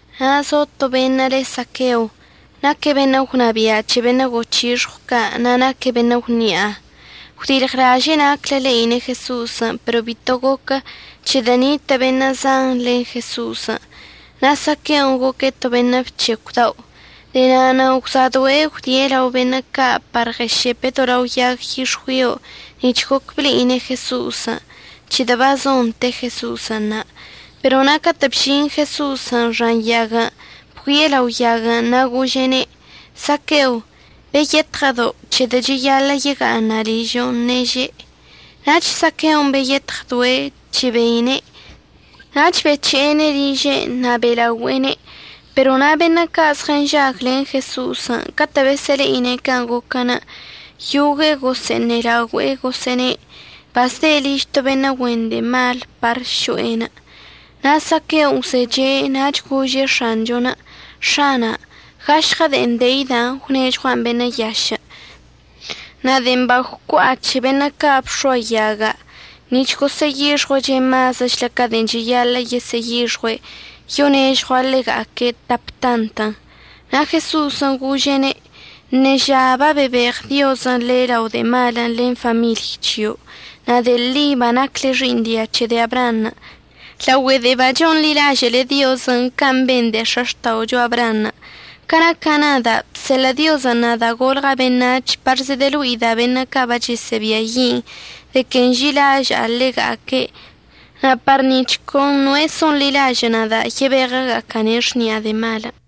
Na' zo to beṉə' le' Saqueo. Naque' beṉə' gwnabia' c̱he beṉə' goc̱hixɉw ca', na' naque' beṉə' gwni'a. Gwdilɉlaže'e naclə le'ine' Jeso'osən' pero bito goquə, c̱hedə' nitə' beṉə' zan len Jeso'osən' na' Saqueon' goque' to beṉə' bc̱hecw dao'. De'e na'anə' gwsa'adoe' gwdie' lao beṉə' ca' par ɉəšepe' to lao yag yix̱güio nic̱h goc ble'ine' Jeso'osən', c̱hedə' bazon te Jeso'osən' na'. Pero na' catə' bžin Jeso'osən' xan yaguən', bgüie' lao yaguən' na' gože'ene': ―Saqueo, beyetɉdodo', c̱hedə' cheyaḻə' yega'aṉa' ližo'on ṉeže'. Nach Saqueon' beyetɉdoe' chebeine' nach bec̱he'ene' liže'enə' na' be'elaogüe'ene'. Pero na' beṉə' ca' zɉənžag len Jeso'osən' catə' besə'əle'ine' can' goquən', yogue'e gosə'əṉelaogüe'e gosə'əne': ―Bazde' liž to beṉə' güen de'e mal par so'enə'. Na' Saqueon' gwzeche' nach gože' X̱anchon': ―X̱ana', gašɉə de'en deida' gwnežɉua'an beṉə' yašə', na' de'en bagwcua'a c̱he beṉə' ca' bx̱oayaga' nic̱h gosə'əyixjue' mazəchlə ca de'en cheyaḻə' yesə'əyixɉue', yonežɉua' ḻega'aque' tap tantən'. Na' Jeso'osən' gože'ene': ―Ṉeža babebeɉ Diozən' le' lao de'e malən' len famiḻy c̱hio', na' de'e ḻi banacle xi'iṉ dia c̱he de'e Abraanṉə' laogüe de'en bachonḻilažə'əle Diozən' can' ben de'e x̱axta'ocho Abraanṉə'. Ca naca' nada', bseḻə' Diozən' nada' golɉa' beṉac̱h par zedəlo'ida' beṉə' ca' bachəsə'əbiayi' de que nži'ilaža'a ḻega'aque' na' par nic̱h con noe' so'onḻilažə' nada' yebeɉəga'aca'ane' xni'a de'e malən'.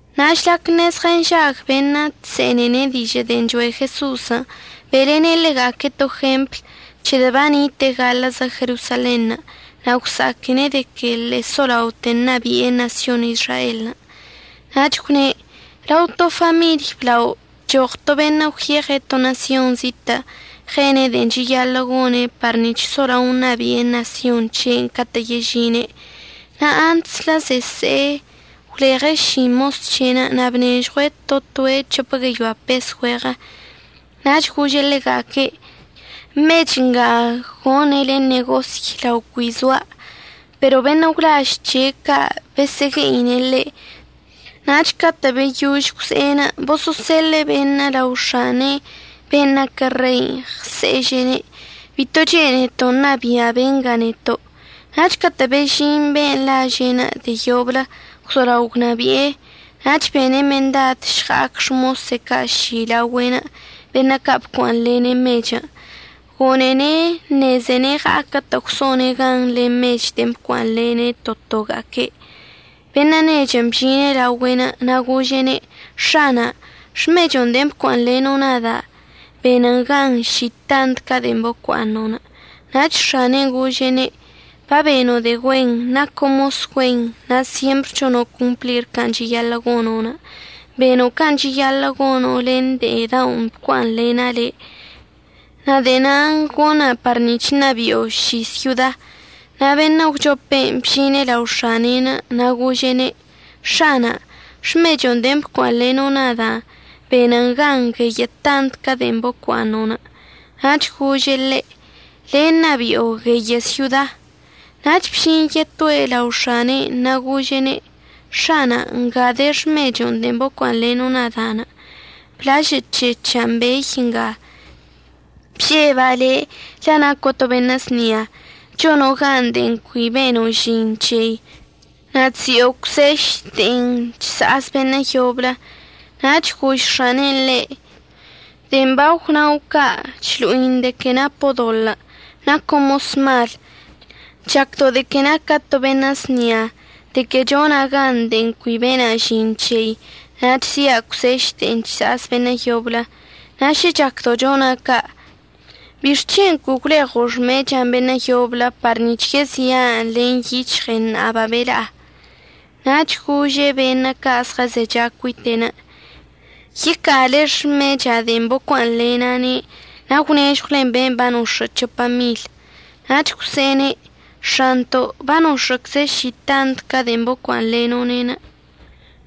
Na' žlac ṉezɉənžag beṉə' chse'enene' dižə' de'en choe' Jeso'osən', be'elene' ḻega'aque' to jempl c̱hedə' banite'e gaḻə'əzə Jerosalenṉə' na' gwsa'aquene' de que ḻe'e solaote ṉabi'e ṉasyon Izraelən'. Nach gwne': ―Lao to famiḻy blao bchoɉ to beṉə' gwyeɉe' to ṉasyon zitə' ɉene' de'en cheyaḻə' gone' par nic̱h solao ṉabi'e ṉasyon c̱he'enə' catə' yežine'. Na' antslə zese'e gwleɉe' ši mos c̱he'enə' na' bnežɉue' to toe' c̱hopə gueyoa pes güeɉə. Nach gože' ḻega'aque': “Mech nga gonele ṉegosy lao cui zoa'.” Pero beṉə' gwlaž c̱he' ca' besə'əgue'ine' ḻe'. Nach catə' beyož gwze'e boso'oseḻe'e beṉə' lao x̱ane'enə' ben' naquə rein' ɉse'eže'ene': “Bito chene'eto' ṉabia' benga neto'.” Nach catə' bežin be'enə' laže'en de'e yoblə gwzolao gwnabi'e, nach bene' mendad əžɉa'ac xmose' ca' ši laogüe'enə', beṉə' ca' bocua'aṉlene' mechən'. Gone'ene' əṉezene' ɉa'aquə'ətə' gwso'one' gan len mechən' de'en bocua'aṉlene' to toga'aque'. Beṉə' nechən' bžine' laogüe'enə' na' gože'ene': “X̱ana', xmecho' de'en bocua'aṉleno' nada' benən gan ši tant ca de'en bocua'aṉo'.” Nach x̱ane'en gože'ene': “Babeno' de'e güen. Naco' mos güen na' syempr chono' complir can' cheyaḻə' gono'. Beno' can' cheyaḻə' gono' len de'e da'on bocua'aṉlena' le', na' de'e nan' gona' par nic̱h ṉabi'o ši syoda.” Na' beṉə' əgwchopen' bžine' lao x̱ane'enə' na' gože'ene': “X̱ana', xmecho' de'en bocua'aṉleno' nda' benən gan gueyə' tant ca de'en bocua'aṉo'.” Nach gože' ḻe': “Le' ṉabi'o gueyə' syoda.” Nach bžin yetoe' lao x̱ane'enə' na' gože'ene': “X̱ana', nga de xmecho' de'en bocua'aṉleno' nada'. Bablažə'əc̱hec̱ha'an bey nga. Bžeba' le' la' naco' to beṉə' znia. Chono' gan de'en cui beno' žin c̱hei, na' chzi'o cwseš c̱he de'en chsa'az beṉə' yoblə.” Nach gož x̱anen' ḻe': “De'en bagwnao' ca' chlo'in de que napo' doḻə'. Naco' mos mal. Chacdo' de que naca' to beṉə' znia, de que chona' gan de'en cui bena' žin c̱hei, na' chzi'a cwseš c̱he de'en chsa'az beṉə' yoblə. Na' šə chacdo' chona' ca', ¿bixc̱hen' cui gwleɉo' xmecha'an beṉə' yoblə par nic̱h yezi'an len yic̱hɉei ṉa'a babeḻa'a?” Nach gože' beṉə' ca' zɉəzecha cuite'enə': “Yeca'ale xmecha'an de'en bocua'aṉlena'ane' na' gwnežɉwlen ben' banox̱ə' c̱hopa mil.” Nach gwse'ene': “X̱anto', banox̱ə'əcze' ši tant ca de'en bocua'aṉleno'one'.”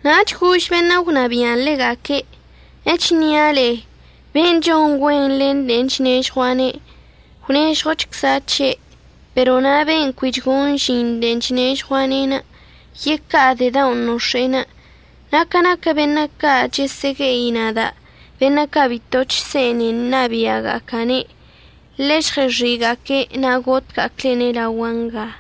Nach gož beṉə' gwnabia'an ḻega'aque': “Echnia' le'e, ben' chon güen len de'en chnežɉua'ane', gwnežɉochcza' c̱he'. Pero na' be'enə' cui chgon žin de'en chnežɉua'ane', yeca'a de'e da'on nox̱e'enə'. Na' ca naquə beṉə' ca' chəsə'əgue'i nada', beṉə' ca' bito chse'ene ṉabi'aga'aca'ane', ḻe'e žɉəx̱i'iga'aque' na' gotga'aclene' laogua' nga.”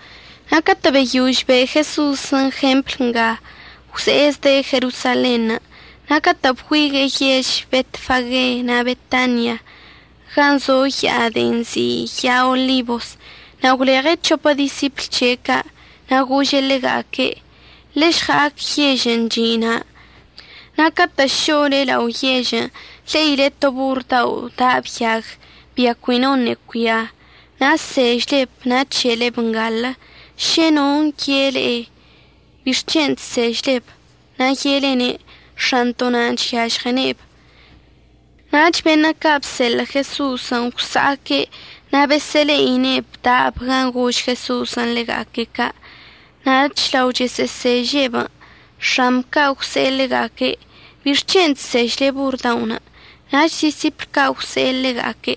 Na' catə' beyož be' Jeso'osən' jempl nga, gwze'e zde' Jerosalenṉə'. Na' catə' bgüigue'e yež Betfage na' Betania, gan' zo ya'a de'en nzi' ya'a Olibos, na' gwleɉe' c̱hopə disipl c̱he' ca'. Na' gože' ḻega'aque': ―Ḻe'e žɉa'ac yežən' chi' na', na' catə' šo'ole lao' yežən' le'ile to borr dao' da'ab yag, bia cui noṉə' cuia. Na' əsežleb na' əc̱he'eleb ngalə. Šə non' ye'e le'e: “¿Bixc̱hen' chsežleb?” na' ye'elene': “X̱anto' nan' chyažɉene'eb.” Nach beṉə' ca' bseḻə' Jeso'osən' gwsa'aque' na' besə'əle'ine'eb da'ab gan' gož Jeso'osən' ḻega'aque' ca'. Nach lao chosə'əseže'eb, x̱amb ca' gwse'e ḻega'aque': ―¿Bixc̱hen' chsežle borr da'onə'? Nach disipl ca' gwse'e ḻega'aque':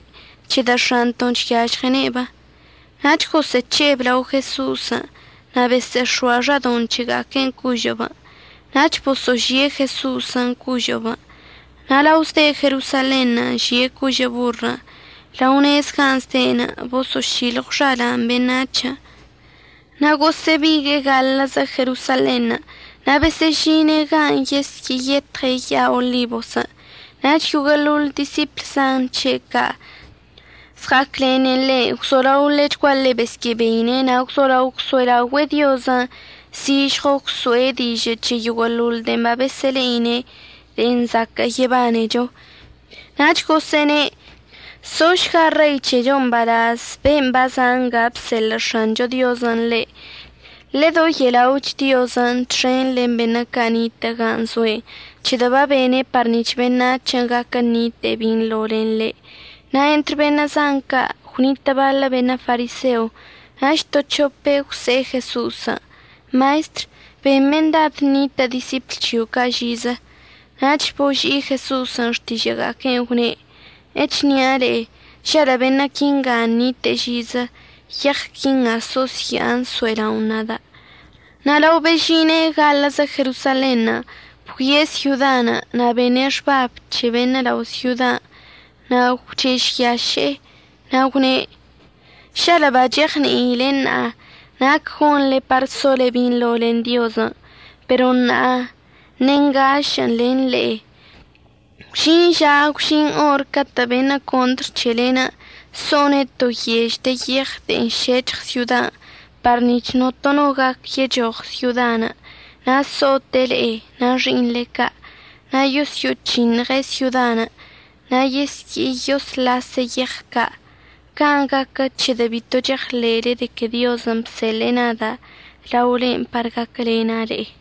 ―C̱hedə' X̱anto'on chyažɉene'eb. Nach gosə'əc̱he'eb lao Jeso'osən' na' besə'əx̱oa xadoṉ c̱hega'aquen' cožə'əbən', nach boso'ožie' Jeso'osən' cožə'əbən'. Na' lao zde' Jerosalenṉə' žie' cožə' borrən', lao nez gan' zde'enə' boso'ošilɉw xala'an beṉac̱hən'. Na' gosə'əbigue'e gaḻə'əzə Jerosalenṉə' na' besə'əžine' gan' yesyə'əyetɉe' ya'a Olibosən'. Nach yoguə'əḻoḻ disipl zan c̱he' ca' zɉa'aclene' ḻe' gwzolao ḻechguaḻe besyə'əbeine' na' gwzolao gwso'elaogüe'e Diozən' zižɉo gwso'e dižə' c̱he yoguə'əḻoḻ de'en babesə'əle'ine' de'e zaquə' yebanecho. Nach gosə'əne': ―Sošga Rei c̱hechon' mbalaz ben' baza' nga bseḻə' X̱ancho Diozən' ḻe'. Ḻedoye'ela'och Diozən' txen len beṉə' ca' nitə' gan' zoe'enə' c̱hedə' babene' par nic̱h beṉac̱hən' gaquə ṉite'e binḻo len ḻe'. Na' entr beṉə' zan ca' gwnitə' baḻə beṉə' fariseo. Nach to c̱hope' gwse'e Jeso'osən': ―Maestr, ben mendad ṉitə' disipl c̱hio' ca' žizə. Nach boži'i Jeso'osən' xtižə'əga'aque'enə' gwne': ―Echnia' le'e, žalə' beṉə' quinga nite'e žizə, yeɉ quinga so'osya'an əso'ela'on nada'. Na' lao bežine' gaḻə'əzə Jerosalenṉə' bgüie' syodan' na' bene' xbab c̱he beṉə' lao syodan' na' gwchežyaše'e. Na' gwne': ―¡Žalə' bacheɉni'ile ṉa'a nac gonḻe par sole binḻo len Diozən'! Pero ṉa'a ṉengašə'ən len le'e. Gwžin ža gwžin or catə' beṉə' contr c̱hele so'one' to yež de yeɉ de'en šec̱hɉ syodan' par nic̱h notono gac yechoɉ syodan'. Na' əso'ote' le'e na' xi'iṉle ca', na' yosyo'oc̱hiṉɉe' syodan' na' yesye'eyosḻase' yeɉ ca'. Can' gaquə c̱hedə' bito cheɉḻe'ele de que Diozən' babseḻə' nada' laolen' par gaquəlena' le'e.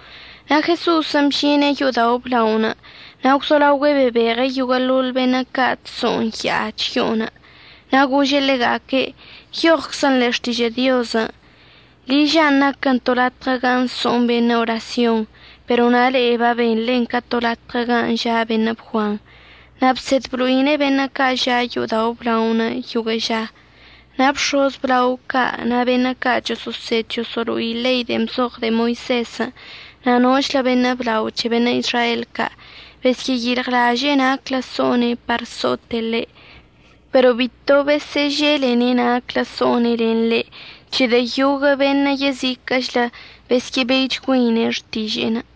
Na' Jeso'osən' bžine' yo'odao' əblaonə' na' gwzolaogüe' bebeɉe' yoguə'əḻoḻ beṉə' ca' chso'on ya'a chyo'onə'. Na' gože' ḻega'aque': ―Nyoɉczən' ḻe'e Xtižə' Diozən': “Liža'an naquən to latɉə gan' so'on beṉə' orasyon”, pero na' le'e babenḻen ca to latɉə gan' ža' beṉə' bguan. Na' bsed blo'ine' beṉə' ca' ža' yo'odao' əblaonə' yoguə' ža. Na' bx̱oz əblao ca' na' beṉə' ca' choso'osed choso'olo'ine' ḻei de'en bzoɉ de'e Moisezən' na' nochlə beṉə' blao c̱he beṉə' Izrael ca' besyə'əyilɉlaže'e naclə so'one' par əso'ote' ḻe'. Pero bito besə'əželene' naclə so'one' len ḻe', c̱hedə' yoguə' beṉə' yeziquə'əchlə besyə'əbeichgüeine' xtiže'enə'.